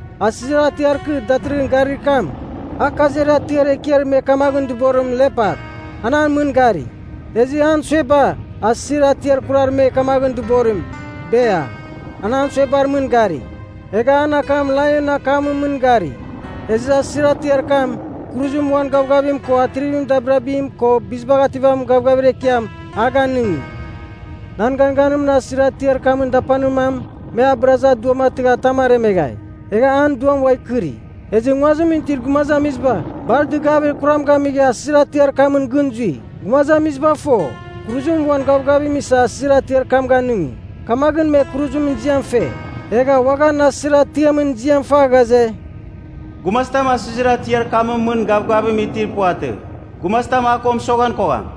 Asɨzir atiar kɨ datɨrɨghɨn garir kam, a kaziar atiar ekiar me kamaghɨn dɨborim lepat, an a mɨn gari. Ezɨ an sueba, asɨzir atiar kurar me kamaghɨn dɨborim bea, an an suebar mɨn gari. Egha an akam laionɨn akamɨn mɨn gari. Ezɨ asɨzir atiar kam, kuruzim uan gavgavim ko atrivir dabirabim ko bizibagh ativamin gavgavir ekiam, a ganɨngi. Nan ganganimɨn asɨzir atiar kamɨn dapanir mam, me a bɨrazɨ a duam atɨgha atam aremeghai, egha an duam ua ikɨri. Ezɨ nguazimɨn itir gumazamiziba bar dɨgavir kuram gamigha asɨzir atiar kamɨn gɨn zui. Gumazamiziba fo, kuruzim uan gavgavim isa asɨzir atiam ganɨngi, kamaghɨn me kuruzimɨn ziam fe. Egha uaghan asɨzir atiamɨn ziam fa ghaze, “Gumazitam asɨzir atiar kamɨn mɨn gavgavim itir puvatɨ! Gumazitam a ko mɨsoghan kogham!”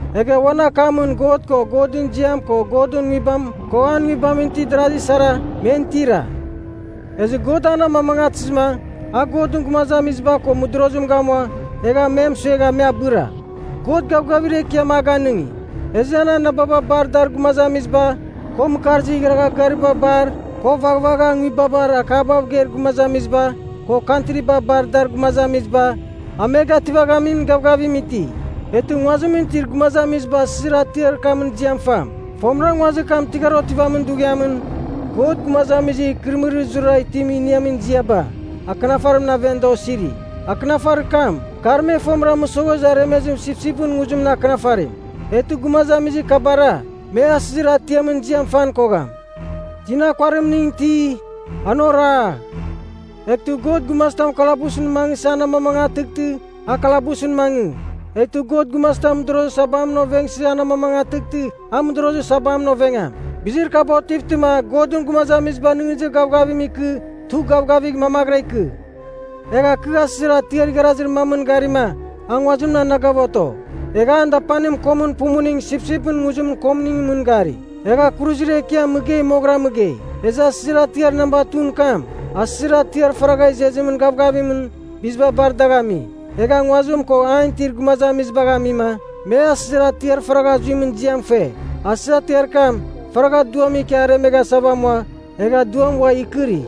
Egha uan akamɨn God ko Godɨn ziam ko Godɨn Nguibam, ko an Nguibamɨn itir darazi sara, men tira. Ezɨ God an amamangatɨzɨma, a Godɨn gumazamiziba ko mɨdorozim gamua, egha me mɨsuegha me abɨra. God gavgavir ekiam a ganɨngi, ezɨ an anababa bar dar gumazamiziba, ko mɨkarzir igharagha gariba bar, ko vaghvagha nguibabar akabav geir gumazamiziba, ko kantriba bar dar gumazamiziba, a me gativaghamin gavgavim iti. Eghtɨ nguazimɨn itir gumazamiziba asɨzir atiar kamɨn ziam fam. Fomɨra, nguazir kam tɨghar otivamin dughiamɨn, God gumazamizir ikɨrɨmɨrir zurara itim iniamin ziaba akɨnafarimɨn aven da osiri. Akɨnafarir kam, kar me fomɨra mɨsoghezɨ aremezir sipsipɨn nguzimɨn akɨnafarim. Eghtɨ gumazamizir kabara, me asɨzir atiamɨn ziam fan kogham. “Tina kuarimning iti, an oragh. Eghtɨ God gumazitam kalabusɨn mangɨsɨ an amamangatɨghtɨ, a kalabusɨn mangɨ. Eghtɨ God gumazitam mɨdorozir sabamɨn ovengsɨ an amamangatɨghtɨ, a mɨdorozir sabamɨn ovengam. Bizir kaba otivtɨma, Godɨn gumazamiziba nɨghnɨzir gavgavim ikɨ tugh gavgavigh mamaghɨra ikɨ.” Egha kɨ asɨzir atiar igharazir mamɨn garima, a nguazimɨn anagav oto. Egha an dapanimɨn komɨn pumuning sipsipɨn nguzimɨn komɨn mɨn gari. Egha kuruzir ekiam mɨgei moghɨra mɨgei. Ezɨ asɨzir atiar namba 2ɨn kam, asɨzir atiar faragha izezimɨn gavgavimɨn biziba bar dagh ami. Egha nguazim ko an itir gumazamizibagh amima, me asɨzir atiar faragha zuimɨn ziam fe. Asɨzir atiar kam, faragha duam ikia aremeghasa amua egha duam ua ikɨri.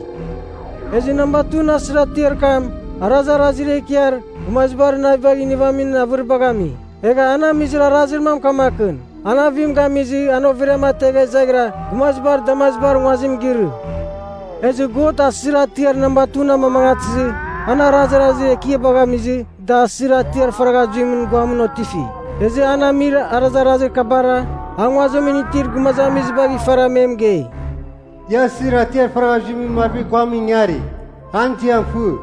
Ezɨ namba 2ɨn asɨzir atiar kam, arazarazir ekiar gumazibar navibagh inivamin avɨribagh ami. Egha an amizir arazir mam kamakɨn, an avim gamizɨ an overiam ategha izaghira gumazibar damazibar nguazim girɨ. Ezɨ God asɨzir atiar namba 2ɨn amamangatɨzɨ, an arazarazir ekiabagh amizɨ da asɨzir atiar faragha zuimɨn guamɨn otifi. Ezɨ an amir arazarazir kabar a nguazimɨn itir gumazamizibagh ifara me mɨgei, “Ia asɨzir atiar faragha zuimɨn marvir guamɨn ingarigh, an ziam fɨ.”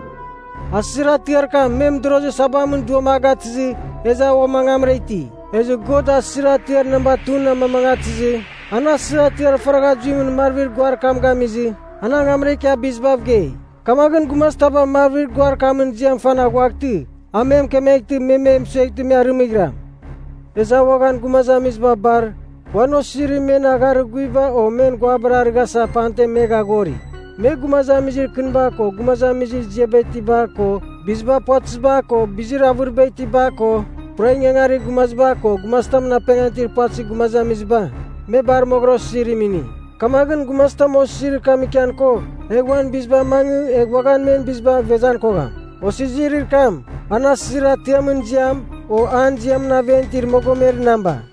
Asɨzir atiar kam, me mɨdorozir sabamɨn duam a gatɨzɨ, ezɨ a uam angamra iti. Ezɨ God asɨzir atiar namba 2ɨn amamangatɨzɨ an asɨzir atiar faragha zuimɨn marvir guar kam gamizɨ, an angamra ikia bizibav gei. Kamaghɨn gumazitaba marvir guar kamɨn ziam fan aghuaghtɨ, a mɨkemeghtɨ me me mɨsueghtɨ me arɨmɨghiram. Ezɨ a uaghan gumazamiziba bar uan osizirim men agharir guviba o men guabar arɨghasa pamten me gaghori. Me, gumazamizir kɨniba ko gumazamizir ziaba itiba ko, biziba puvatɨziba ko, bizir avɨriba itiba ko, pura ingangarir gumazamiziba ko gumazitamɨn apengan itir puvatɨzir gumazamiziba, me bar osizirim ini. Kamaghɨn, gumazitam osizirir kam ikian kogh, egh uan biziba amangɨ egh uaghan men bizibagh ivezan kogham. Osizirir kam, an asɨzir atiamɨn ziam, o an ziamɨn aven itir mogomer namba.